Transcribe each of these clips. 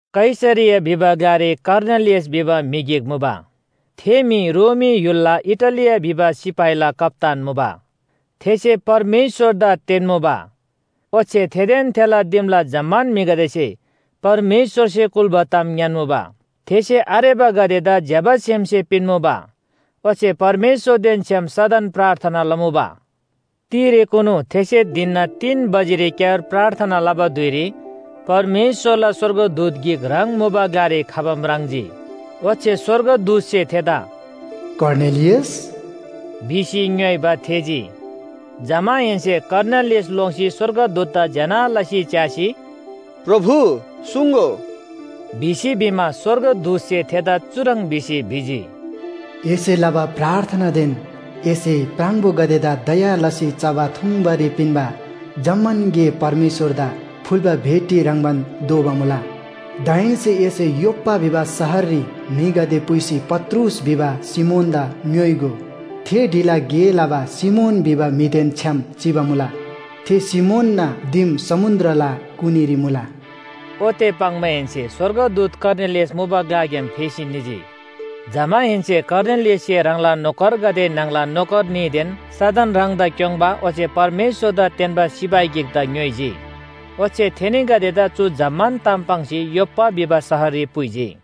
कैसरिया भिबा ग्‍लारी कर्नेलियस भिबा म्‍हि गिक मुबा, थे म्‍हि रोमी य्‍हुलला इटालिया भिबा सिपाहीला कप्‍तान मुबा। थेसे परमेश्‍वरदा तेन्‍मुबा, ओच्‍छे थेदेन थेला दिमला जम्‍मान म्‍हिगदेसे परमेश्‍वरसे कुल्‍बा ताम ङ्‌यान्‍मुबा। थेसे आरेबागदेदा ज्‍यबा सेमसे पिन्‍मुबा। ओच्‍छे परमेश्‍वरदेन छ्‌याम सदन प्रार्थना लमुबा। तिरेकुनु थेसे धिनना तीन बजेरीक्‍यार प्रार्थना लबा धुइरी परमेश्‍वरला स्‍वर्गदूत गिक ह्राङ मुबा ग्‍लारी खबा म्राङ्जी। ओच्‍छे स्‍वर्गदूतसे थेदा “कर्नेलियस!” भिसी ङ्‌योइबा थेःजी। जमाहेन्‍से कर्नेलियस लोङ्सी स्‍वर्गदूतदा ज्‍यना लसी च्‍यासी, “प्रभु, सुङ्‍गो” भिसी भिमा, स्‍वर्गदूतसे थेदा चुह्रङ् भिसी भिजी, “एसे लबा प्रार्थनादेन एसे प्राङबोगदेदा दया लसी चबा थुङ्बारी पिन्‍बा जम्‍मान गे परमेश्‍वरदा फुल्‍बा भेटी ह्रङ्‌बान दोबा मुला। दाहेन्‍से एसे योप्‍पा भिबा शहररी म्‍हिगदे पुइसी पत्रुस भिबा सिमोनदा ङ्‌योइगो। थे ढिला गे लबा सिमोन भिबा म्‍हिदेन छ्‌याम चिबा मुला, थे सिमोनना दिम समुन्‍द्रला कुनीरी मुला।” ओते पाङ्माहेन्‍से स्‍वर्गदूत कर्नेलियस मुबाग्‍याम फेसी निजी। जमाहेन्‍से कर्नेलियससे ह्राङला नोकरगदे न्‍हङला नोकर न्‍हीदेन सदन ह्राङदा क्‍योङ्बा ओच्‍छे परमेश्‍वरदा तेन्‍बा सिपाही गिकदा ङ्‌योइजी। ओच्‍छे थेनीगदेदा चु जम्‍मान ताम पाङ्सी योप्‍पा भिबा शहररी पुइजी।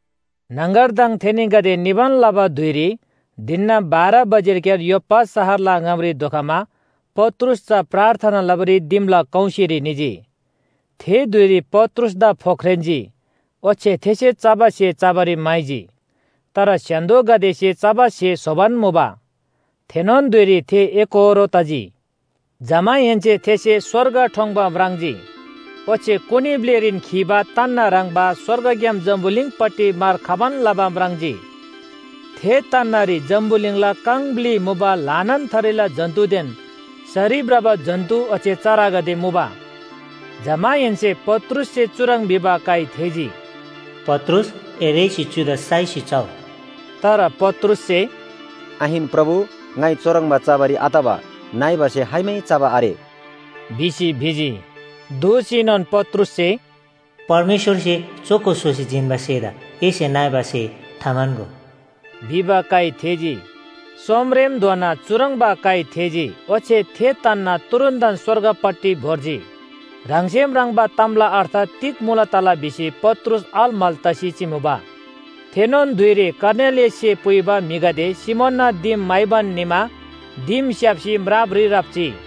न्‍हङगरदङ थेनीगदे निबान लबा धुइरी धिनना बाह्र बजेरीक्‍यार योप्‍पा शहरला ङामरी धोखमा पत्रुस चा प्रार्थना लबारी दिमला कौसीरी निजी। थे धुइरी पत्रुसदा फोख्रेन्‍जी, ओच्‍छे थेसे चबा स्‍हे चबारी म्‍हाइजी। तर स्‍य्‍हान्‍दोगदेसे चबा स्‍हे स्‍होबान मुबा, थेनोन धुइरी थे एकोहोरो तजी। जमाहेन्‍से थेसे स्‍वर्ग ठोङ्‌बा म्राङ्जी ओच्‍छे कुनी ब्‍लिरीन खीबा तन्‍ना ह्रङ्‌बा स्‍वर्गग्‍याम जम्‍बुलिङपट्टि मार खबान लबा म्राङ्जी। थे तन्‍नारी जम्‍बुलिङला काङ ब्‍लि मुबा ल्‍हानान थरीला जन्‍तुदेन सरी भ्रबा जन्‍तु ओच्‍छे चरागदे मुबा। जमाहेन्‍से पत्रुससे चुह्रङ् भिबा काइ थेःजी, “पत्रुस, ए रेःसी चुदा साइसी चउ।” तर पत्रुससे “आहिन प्रभु, ङाइ चुह्रङ्बा चबारी आतबा नइबा स्‍हे खाइमै चबा आरे” भिसी भिजी। दोःसीनोन पत्रुससे “परमेश्‍वरसे चोखो स्‍होसी जिन्‍बा स्‍हेदा एसे नइबा स्‍हे थाम्‍हन्‍गो” भिबा काइ थेःजी। सोमरेमधोना चुह्रङ्बा काइ थेःजी, ओच्‍छे थे तन्‍ना तुरुन्‍तन स्‍वर्गपट्टि भोर्जी। ह्राङसे म्राङ्बा तामला अर्थ तिग मुला तला भिसी पत्रुस अलमल तसी चिमुबा। थेनोन धुइरी कर्नेलियससे पुइबा म्‍हिगदे सिमोनना दिम म्‍हाइबान निमा दिम स्‍याप्‍सी म्रापरी राप्‍जी।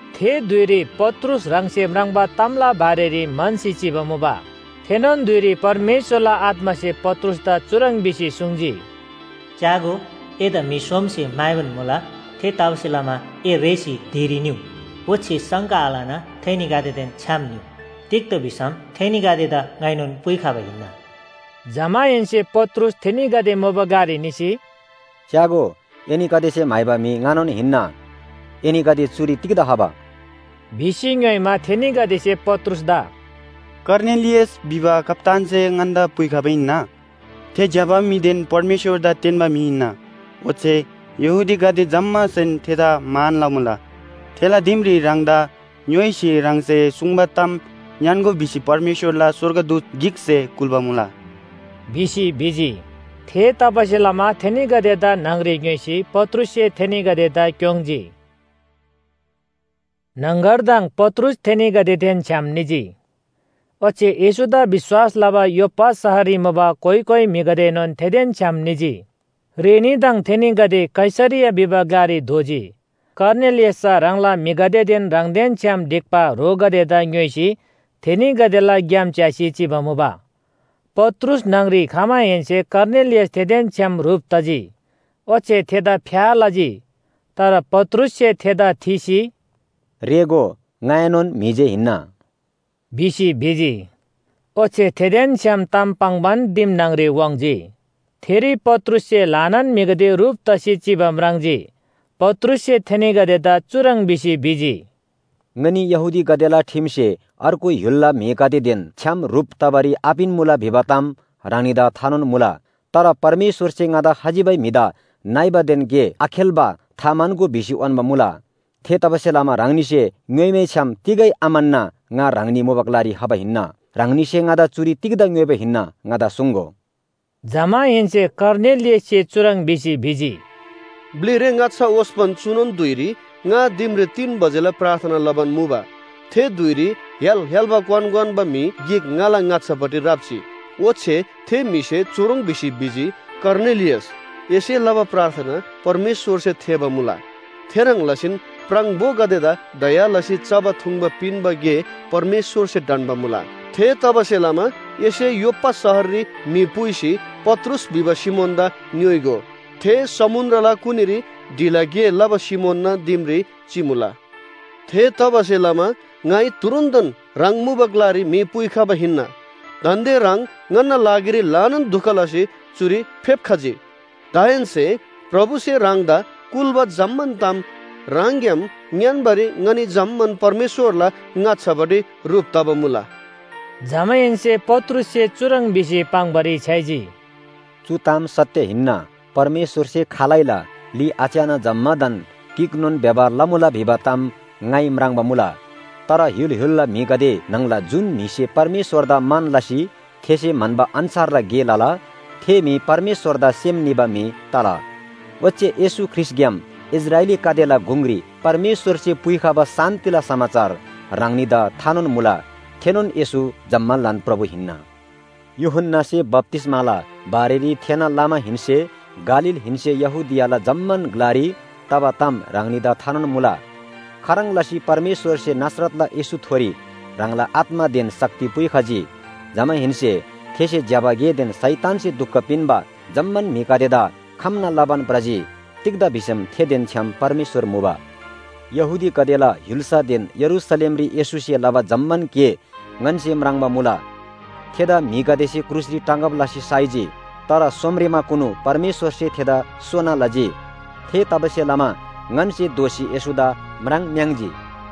थे धुइरी पत्रुस ह्राङसे म्राङ्बा तामला बारेरी म्‍हन्‍सी चिबा मुबा। थेनोन धुइरी परमेश्‍वरला आत्‍मासे पत्रुसदा चुह्रङ् भिसी सुङ्जी, “च्‍यागो, एदा म्‍हि सोमसे म्‍हाइबान मुला। थेतबासेलमा ए रेःसी धिरी निउ, ओच्‍छे शङ्का आलना थेनीगदेदेन छ्‌याम निउ, तिग्‍दा भिसम थेनीगदेदा ङाइनोन पुइखबा हिन्‍ना।” जमाहेन्‍से पत्रुस थेनीगदे मुबा ग्‍लारी निसी, “च्‍यागो, एनीगदेसे म्‍हाइबा म्‍हि ङानोन हिन्‍ना। एनीगदे चुरी तिग्‍दा खबा?” भिसी ङ्‌योइमा, थेनीगदेसे पत्रुसदा “कर्नेलियस भिबा कप्‍तानसे ङन्‍दा पुइखबा हिन्‍ना। थे ज्‍यबा म्‍हिदेन परमेश्‍वरदा तेन्‍बा म्‍हि हिन्‍ना, ओच्‍छे यहूदीगदे जम्‍मासेन थेदा मान लमुला। थेला दिमरी ह्राङदा ङ्‌योइसी ह्राङसे सुङ्बा ताम ङ्‌यान्‍गो भिसी परमेश्‍वरला स्‍वर्गदूतगदे गिकसे कुल्‍बा मुला” भिसी भिजी। थेतबासेलमा थेनीगदेदा न्‍हङरी ङ्‌योइसी पत्रुससे थेनीगदेदा क्‍योङ्‌जी। न्‍हङगरदङ पत्रुस थेनीगदेदेन छ्‌याम निजी, ओच्‍छे येशूदा विश्‍वास लबा योप्‍पा शहररी मुबा कोइ कोइ म्‍हिगदेएनोन थेदेन छ्‌याम निजी। रेनीदङ थेनीगदे कैसरिया भिबा ग्‍लारी धोजी। कर्नेलियससे चा ह्राङला म्‍हिगदेदेन ह्राङदेन छ्‌याम ढिक्‍बा ह्रोगदेदा ङ्‌योइसी थेनीगदेला ग्‍याम च्‍यासी चिबा मुबा। पत्रुस न्‍हङरी खमाहेन्‍से कर्नेलियस थेदेन छ्‌याम ह्रुप तजी, ओच्‍छे थेदा फ्‍या लजी। तर पत्रुससे थेदा थीसी, “रेःगो, ङाएनोन म्‍हि जे हिन्‍ना” भिसी भिजी। ओच्‍छे थेदेन छ्‌याम ताम पाङ्‌बान दिम न्‍हङरी वाङ्‌जी, थेरी पत्रुससे ल्‍हानान म्‍हिगदे ह्रुप तसी चिबा म्राङ्जी। पत्रुससे थेनीगदेदा चुह्रङ् भिसी भिजी, “ङनी यहूदीगदेला ठिमसे अर्गु य्‍हुलला म्‍हिगदेदेन छ्‌याम ह्रुप तबारी आपिन्‍मुला भिबा ताम ह्राङनीदा थानोन मुला, तर परमेश्‍वरसे ङादा खजिबै म्‍हिदा नइबादेन गे आखेल्‍बा थाम्‍हन्‍गो भिसी उन्‍बा मुला। थेतबासेलमा ह्राङनीसे ङ्‍योइमैछ्‍याम तिगै आम्‍हन्‍ना ङा ह्राङनी मुबा ग्‍लारी खबा हिन्‍ना। ह्राङनीसे ङादा चुरी तिग्‍दा ङ्‌योइबा हिन्‍ना ङादा सुङ्‍गो।” जमाहेन्‍से कर्नेलियससे चुह्रङ् भिसी भिजी, “ब्‍लिरे ङाच्‍छा ओस्‍पन चुनोन धुइरी ङा दिमरी तीन बजेला प्रार्थना लबान मुबा थे धुइरी य्‍हाल य्‍हाल्‍बा क्‍वान क्‍वान्‍बा म्‍हि गिक ङाला ङाच्‍छापट्टि राप्‍जी। ओच्‍छे थे म्‍हिसे चुह्रङ् भिसी भिजी, ‘कर्नेलियस, एसे लबा प्रार्थना परमेश्‍वरसे थेःबा मुला, थेह्रङ् लसीन प्राङबोगदेदा दया लसी चबा थुङ्बा पिन्‍बा गे परमेश्‍वरसे ढन्‍बा मुला। थेतबासेलमा एसे योप्‍पा शहररी म्‍हि पुइसी पत्रुस भिबा सिमोनदा ङ्‌योइगो। थे समुन्‍द्रला कुनीरी ढिला गे लबा सिमोनना दिमरी चिमुला।’ थेतबासेलमा ङाइ तुरुन्‍तन ह्राङ मुबा ग्‍लारी म्‍हि पुइखबा हिन्‍ना, दान्‍दे ह्राङ ङन्‍ना लागिरी ल्‍हानान दुख लसी चुरी फेप्‍खजी। दाहेन्‍से प्रभुसे ह्राङदा कुल्‍बा जम्‍मान ताम ह्राङग्‍याम ङ्‌यान्‍बारी ङनी जम्‍मान परमेश्‍वरला ङाच्‍छापट्टि ह्रुप तबा मुला।” जमाहेन्‍से पत्रुससे चुह्रङ् भिसी पाङ्‌बारी छ्‌याइजी, “चु ताम सत्‍य हिन्‍ना, परमेश्‍वरसे खालैला ली आच्‍याना जम्‍मादान गिकनोन व्‍यवहार लमुला भिबा ताम ङाइ म्राङ्बा मुला। तर य्‍हुल य्‍हुलला म्‍हिगदे न्‍हङला जुन म्‍हिसे परमेश्‍वरदा मान लसी थेसे म्‍हन्‍बा अन्‍छारला गे लला थे म्‍हि परमेश्‍वरदा सेम निबा म्‍हि तला। ओच्‍छे येशू ख्रीष्‍टग्‍याम इस्राएलीगदेला गुङरी परमेश्‍वरसे पुइखबा शान्‍तिला समाचार ह्राङनीदा थानोन मुला। थेनोन येशू जम्‍मालान प्रभु हिन्‍ना। यूहन्‍नासे बप्‍तिस्‍माला बारेरी थेःना लमाहेन्‍से गालीलहेन्‍से यहूदियाला जम्‍मान ग्‍लारी तबा ताम ह्राङनीदा थानोन मुला। खाह्रङ् लसी परमेश्‍वरसे नासरतला येशूथोरी ह्राङला आत्‍मादेन शक्ति पुइखजी। जमाहेन्‍से थेसे ज्‍यबा गेदेन शैतानसे दुख पिन्‍बा जम्‍मान म्‍हिगदेदा खम्‍ना लबान भ्रजी, तिग्‍दा भिसम थेदेन छ्‌याम परमेश्‍वर मुबा। “यहूदीगदेला य्‍हुल्‍सादेन यरूशलेमरी येशूसे लबा जम्‍मान गे ङन्‍से म्राङ्बा मुला। थेदा म्‍हिगदेसे क्रुसरी टाँगब लसी साइजी। तर सोमरेमाकुनु परमेश्‍वरसे थेदा सोना लजी। थेतबासेलमा ङन्‍से दोःसी येशूदा म्राङ्‌म्‍याङ्‌जी।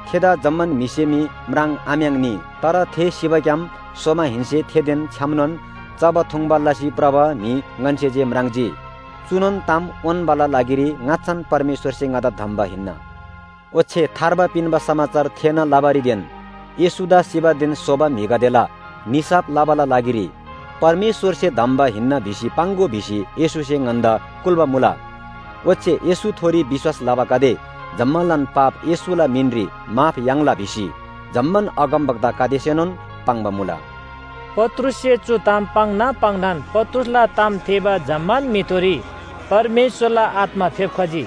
थेदा जम्‍मान म्‍हिसे मी म्राङ्‌आम्‍याङ्‌नी, तर थे सिबाग्‍याम सोमाहेन्‍से थेदेन छ्‌यामनोन चबा थुङ्बा लसी भ्रबा म्‍हि ङन्‍से जे म्राङ्जी। चुनोन ताम उन्‍बाला लागिरी ङाच्‍छान परमेश्‍वरसे ङन्‍दा धम्‍बा हिन्‍ना। ओच्‍छे थार्बा पिन्‍बा समाचार थेःना लबारीदेन येशूदा सिबादेन सोबा म्‍हिगदेला निसाफ लबाला लागिरी परमेश्‍वरसे धम्‍बा हिन्‍ना भिसी पाङ्‍गो भिसी येशूसे ङन्‍दा कुल्‍बा मुला। ओच्‍छे येशूथोरी विश्‍वास लबागदे जम्‍मालान पाप येशूला मिनरी माफ याङ्ला भिसी जम्‍मान अगमवक्तागदेसेनोन पाङ्बा मुला।” पत्रुससे चु ताम पाङ्ना पाङ्नान पत्रुसला ताम थेःबा जम्‍मान म्‍हिथोरी परमेश्‍वरला आत्‍मा फेप्‍खजी।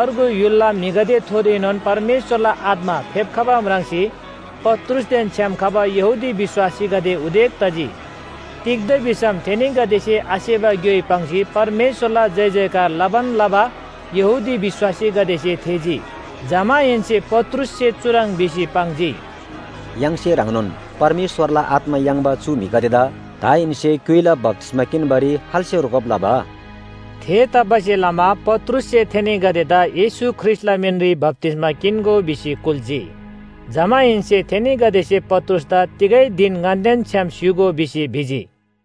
अर्गु य्‍हुलला म्‍हिगदेथोरीएनोन परमेश्‍वरला आत्‍मा फेप्‍खबा म्राङ्सी पत्रुसदेन छ्‌याम खबा यहूदी विश्‍वासीगदे उदेक तजी। तिग्‍दा भिसम थेनीगदेसे आसेबा ग्‍योइ पाङ्सी परमेश्‍वरला जयजयकार लबान लबा यहूदी विश्‍वासीगदेसे थेःजी। जमाहेन्‍से पत्रुससे चुह्रङ् भिसी पाङ्जी, “य्‍हाङसे ह्रङ्नोन परमेश्‍वरला आत्‍मा याङ्बा चु म्‍हिगदेदा दाहेन्‍से क्‍युइला बप्‍तिस्‍मा किन्‍बारी खाल्‍से रोकब लबा?” थेतबासेलमा पत्रुससे थेनीगदेदा येशू ख्रीष्‍टला मिनरी बप्‍तिस्‍मा किन्‍गो भिसी कुल्‍जी। जमाहेन्‍से थेनीगदेसे पत्रुसदा तिगै धिन ङन्‍देन छ्‌याम स्‍य्‍हूगो भिसी भिजी।